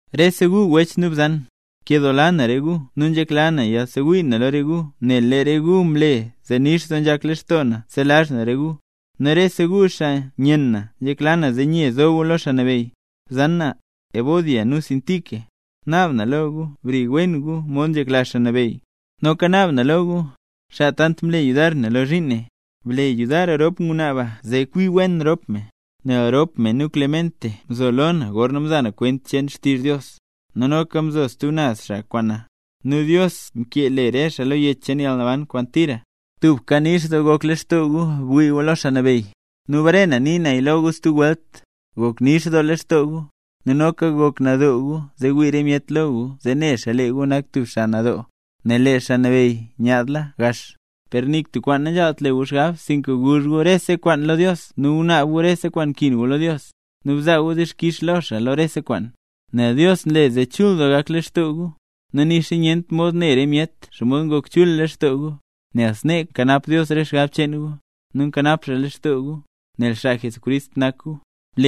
Rese gu wech nu bzan, nkedoola na re gu nu nzhekla na yasewii na lo re gu nel lee re gu mle zee nix doo nzhak lextoo na selazh na re gu. Nu rese gu xaa nyenn na nzhekla na zee nye nzo gu lo Xaa Nabeyy. Bzan na, Evodia nu Síntique, naab na lo gu, bri wen gu mod nzhekla Xaa Nabeyy. Noka naab na lo lu, xaa tant mle yudar na lo zhiin ne, ble yudar rop ngwnaa ba zee kwi wen rop me, nel rop me nu Clemente mzo lo na gorna mza na kwent cheen xtizh Dios, nu noka mzo stub naz xaa kwaan na. Nu Dios mkee le re xaa lo yech cheen yalnaban kwaan tira. Tubka nix doo gok lextoo gu bwii gu lo Xaa Nabeyy, nu bare na nii naya lo gu stub welt, gok nix doo lextoo gu. Nu noka gok nadoo gu zee wii re myet lo gu zee ne xaa lee gu nak tub xaa nadoo, nel lee Xaa Nabeyy nyaadla gax. Per nik tub kwaan nanzhaalt le gu xgab, sinka guzh gu rese kwaan lo Dios nu gunaab gu rese kwaan nkin gu lo Dios, nu bzaa gu dixkix lo xaa lo rese kwaan. Nel Dios nle zee chul doo gak lextoo gu, nu nixa nyent mod ne re myet xomod ngok chul lextoo gu. Nel snee nkanap Dios re xgab cheen gu, nu nkanap xaa lextoo gu, nel xaa Jesucrist nak gu.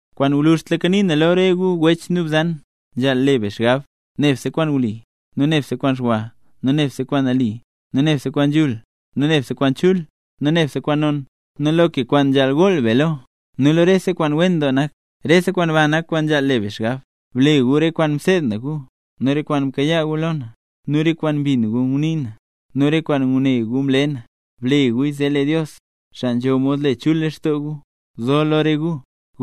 Kwaan gwluzhtlaka nii na lo re gu wech nu bzan, nzhaal le be xgab: nebse kwaan wli, nu nebse kwaan xwa, nu nebse kwaan nali, nu nebse kwaan nzhul, nu nebse kwaan chul, nu nebse kwaan non, nu loka kwaan nzhaal gool be lo, nu rese kwaan wen doo nak. Rese kwaan ba nak kwaan nzhaal le be xgab. Ble gu re kwaan mseed na gu, nu re kwaan mkayaa gu lo na, nu re kwaan mbin gu ngunii na, nu re kwaan ngune gu mle na. Ble guya zee lee Dios, xaa nzho mod le chul lextoo gu, zo lo re gu.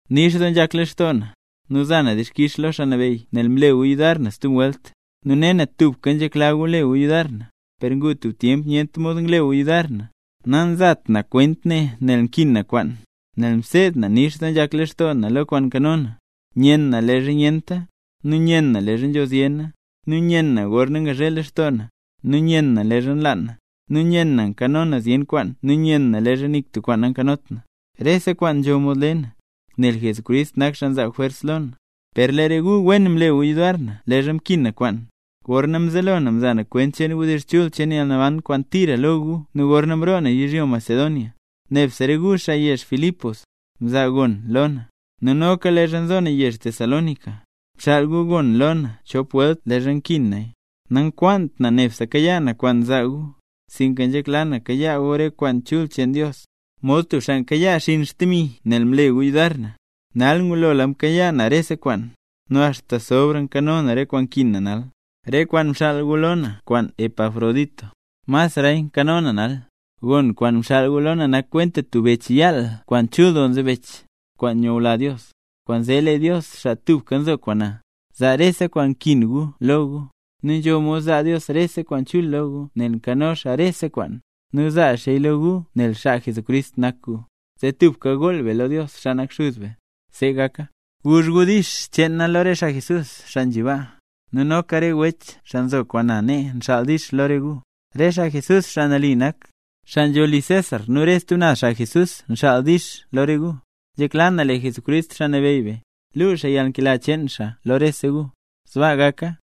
Nix doo nzhak lextoo na, nu za na dixkix lo Xaa Nabeyy nel mle gu yudar na stub welt, nu ne na tubka nzhekla gu le gu yudar na, per ngu tub tyemp nyent mod ngle gu yudar na. Nazat na kwent ne nel nkin na kwaan; nel mseed na nix doo nzhak lextoo na lo kwaan nkano na. Nyen na leezha nyenta, nu nyen na leezha nzho zyena, nu nyen na gorna ngazhe lextoo na, nu nyen na leezha nlaan na, nu nyen na nkano na zyen kwaan nu nyen na leezha nik tub kwaan nankanot na. Rese kwaan nzho mod le na, nel Jesucrist nak xaa nzaa jwers lo na. Per lee re gu wen mle gu yudar na leezha mkin na kwaan. Gorna mzelo na mza na kwent cheen wdizh chul cheen yalnaban kwaan tira lo gu nu gorna mroo na yizhyo Macedonia, nebse re gu xaa yezh Filipos, mzaa gon lo na. Nu noka leezha nzo na yezh Tesalónica, mxaal gu gon lo na chop welt leezha nkin naya. Nankwaant na nebse kayaa na kwaan zaa gu, sinka nzhekla na kayaa gu rese kwaan chul cheen Dios, mod tub xaa nkayaa xinn xdemi nel mle gu yudar na. Nal ngulola mkayaa na rese kwaan, nu axta nzho nkano na re kwaan nkin na nal; re kwaan mxaal gu lo na kwaan wech Epafrodito, masraya nkano naya nal. Gon kwaan mxaal gu lo na nak kwenta tub bech cheen yaal kwaan chul doo nzebech, kwaan nyula Dios. Kwaanzee lee Dios, xaa tubka nzo kwaan be, zaa rese kwaan nkin gu lo gu. Nu nzho mod zaa Dios re kwaan chul lo gu nel nkano xaa rese kwaan, nu zaa xaaya lo gu nel xaa Jesucrist nak gu. Zee tubka gool be lo Dios, xaa nak Xuz be. ¡See gaka! Guzh gu “dix” cheen na lo re xaa mle nambey Jesús, xaa nzhi baa. Nu noka re wech xaa nzo kwaan na nee nxaal “dix” lo re gu. Re xaa Jesús, xaa nambey nak, xaa nzho li César nu re stub naz xaa Jesús nxaal “dix” lo re gu. Nzhekla na lee Jesucrist, Xaa Nabeyy be, luu xaa yalnkela cheen xaa lo rese gu. Sbaa gaka.